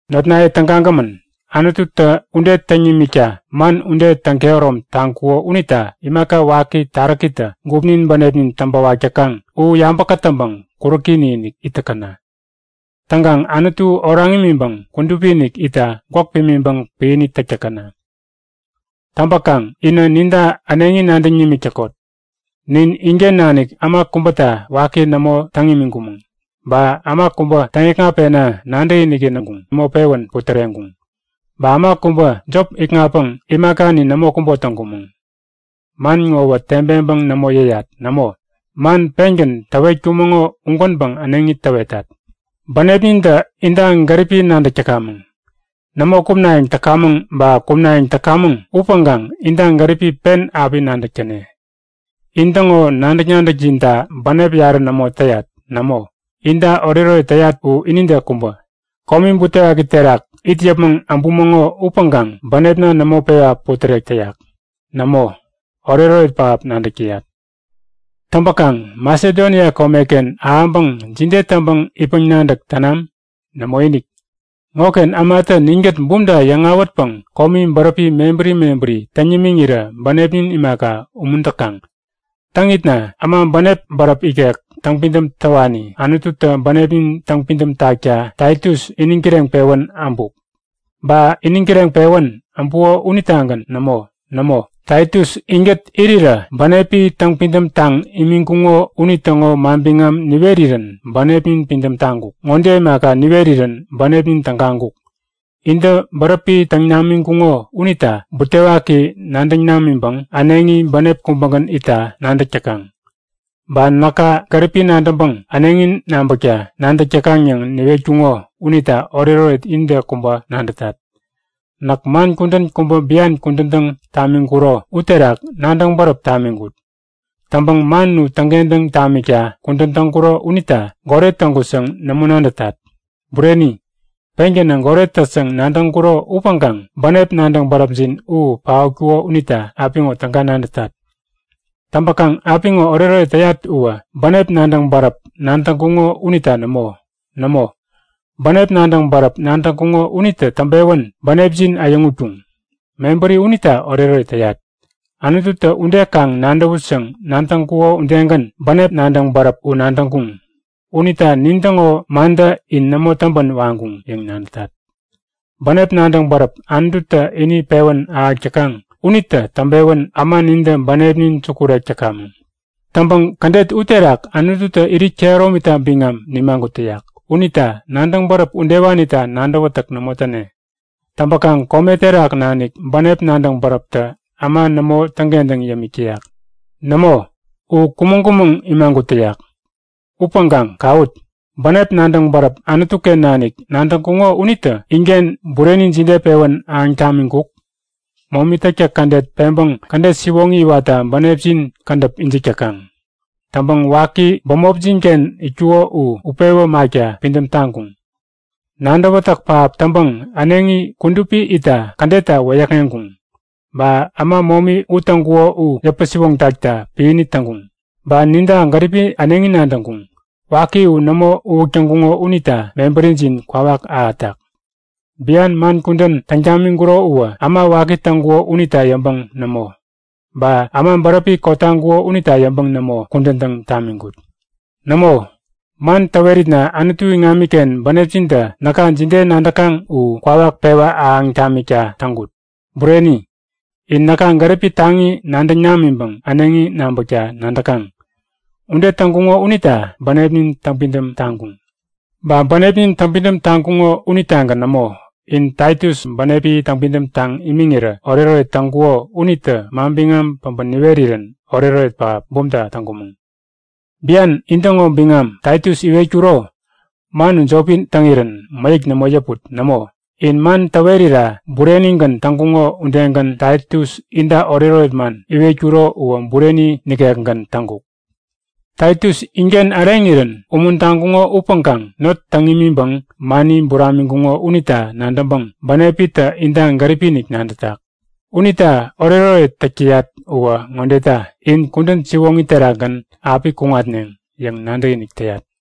Notnaye tägagämän, Anututä ude täŋ nimikta man ude täŋkehärom taŋkuko unita imaka waki taräkitä gupnin bänepnin täŋpäwak täkaŋ u yabä kätäŋpäŋ kuräki-inik it täkäna. Täŋkaŋ Anutu oraŋ imiŋpäŋ kudupi-inik itta gwäk pimiŋpäŋ piäni täk täkäna. Täŋpäkaŋ inä ninta äneŋi nadäŋ nimik täkot. Nin inken nanik äma kubäta waki nämo täŋ imiŋkumäŋ. Ba äma kubä täŋ-ikŋatpena nadäkiniki nämo pewän putäreŋkuŋ. Ba äma kubä jop ikŋatpäŋ imakani nämo kubo täŋkumäŋ. Man ŋowä tebeŋpäŋ nämo yäyat. Nämo, man pengän täwetkumäŋo ugänpäŋ äneŋi täwetat; Bänepnintä inta gäripi nadäk täkamäŋ. Nämo kumnayäŋ täkamäŋ ba kumnayäŋ täkamäŋ upäŋkaŋ inta gäripi pen api nadäk täne. In-täŋo nadäk-nadäkjinta bänep yarä nämo täyat. Nämo, inta oretoret täyat u inide kubä. Komi butewaki punin terak it yäpmäŋ äbumäŋo upäŋkaŋ bänepna nämo pewa putärek täyak. Nämo, oretoret pähap nadäk täyat. Täŋpäkaŋ Masedonia komeken ahäŋpäŋ jide täŋpäŋ itpäŋ-nadäk tänam? Nämoinik. Ŋoken ämatä ninkät bumta yäŋ-awätpäŋ komi bäräpi mebäri mebäri täŋ nimiŋirä bänepnin imaka, umuntaŋkuŋ. Täŋitna äma bänep bäräp ikek täŋpidäm täwani Anututä bänepnin täŋpidäm takta Taitus iniŋ kireŋpewän äbuk. Ba iniŋ kireŋpewän äbuko unitagän nämo. Nämo, Taitus inkät irirä bänepi täŋpidäm taŋ imiŋkuŋo unitäŋo manbiŋam niwerirän bänepnin pidäm taŋkuk. Ŋode imaka niwerirän bänepnin tägaŋkuk; Intä bäräpi täŋ namiŋkuŋo unita butewaki nadäŋ namiŋpäŋ äneŋi bänep kubägän itta nadäk täkaŋ. Ba näka gäripi nadäŋpäŋ äneŋi nabäkta nadäk täkaŋ yäŋ niwetkuko unita oretoret inide kubä nadätat. Näk man kudän kubä bian kudän täŋ tamiŋkuro uterak nadäŋ bäräp tamiŋkut. Täŋpäŋ man u täŋkentäŋ tamikta kudän täŋkuro unita goret täŋkut yäŋ nämo nadätat. Bureni, pengänä goret tät yäŋ nadäŋkuro upäŋkaŋ bänep nadäŋ bäräpjin u paotkuko unita apiŋo täga nadätat. Täŋpäkaŋ apiŋo oretoret täyat uwä bänep nadäŋ bäräp nadäŋkuŋo unita nämo. Nämo, bänep nadäŋ bäräp nadäŋkuŋo unitä täŋpewän bänepjin äyäŋutkuŋ. Mebäri unita oretoret täyat. Anututä ude kaŋ nadäwut yäŋ nadäŋkuko udegän bänep nadäŋ bäräp u nadäŋkuŋ. Unita nintäŋo mantä in nämo täŋpän waŋkuŋ yäŋ nadätat. Bänep nadäŋ bäräp Anututä ini pewän ahäk täkaŋ unitä täŋpewän äma nintä bänepnin sukurek täkamäŋ. Täŋpäŋ kädet uterak Anututä irit kehäromita biŋam nimagut täyak. Unita nadäŋ bäräp udewanita nadäwätäk nämo täne. Täŋpäkaŋ kome terak nanik bänep nadäŋ bäräptä äma nämo täŋkentäŋ yämik täyak. Nämo, u kumäŋ-kumäŋ imagut täyak. Upäŋkaŋ kawut! Bänep nadäŋ bäräp Anutu-ken nanik nadäŋkuŋo unitä inken bureni jide pewän ahäŋ tamiŋkuk? Momi täktäk kädet peŋpäŋ kädet siwoŋi iwatta bänepjin kädäp ijik täkaŋ. Täŋpäŋ waki bämopjin-ken itkuko u utpewä makta pidäm taŋkuŋ. Nadäwätäk pähap täŋpäŋ äneŋi kudupi itta kädetta wäyäkŋeŋkuŋ, ba äma momi u täŋkuko u yäpä-siwoŋ takta piäni täŋkuŋ, ba ninta gäripi äneŋi nadäŋkuŋ. Waki u nämo uwäk täŋkuŋo unita mebärijin kwawak ahätak. Bian man kudän täŋ tamiŋkuro uwä äma waki täŋkuko unita yäŋpäŋ nämo, ba äma bäräpi kotaŋkuko unita yäŋpäŋ nämo kudän täŋ tamiŋkut. Nämo, man täweritna Anutu iŋamiken bänepjintä näka jide nadäkaŋ u kwawak pewa ahäŋ tamikta täŋkut; Bureni, in näka gäripi taŋi nadäŋ namiŋpäŋ äneŋi nabäkta nadäkaŋ. Ude täŋkuŋo unita bänepnin täŋpidäm taŋkuŋ. Ba bänepnin täŋpidäm taŋkuŋo unitagän nämo. In Taitus bänepi täŋpidäm taŋ imiŋirä oretoret täŋkuko unitä manbiŋam päbä niwerirän oretoret pähap, bumta täŋkumäŋ. Bian intäŋo biŋam Taitus iwetkuro, man u jopi täŋirän mäyäk nämo yäput. Nämo, in man täwerira burenigän täŋkuŋo udegän Taitus inta oretoret man iwetkuro uwä bureni nikekgän täŋkuk. Taitus inken äreŋirän umuntaŋkuŋo upäŋkaŋ not täŋ imiŋpäŋ mani buramiŋkuŋo unita nadäŋpäŋ bänepitä inta gäripi-inik nadätak. Unita oretoret täk täyat uwä ŋodeta; In kudän siwoŋi terakgän api kuŋatneŋ yäŋ nadäkinik täyat.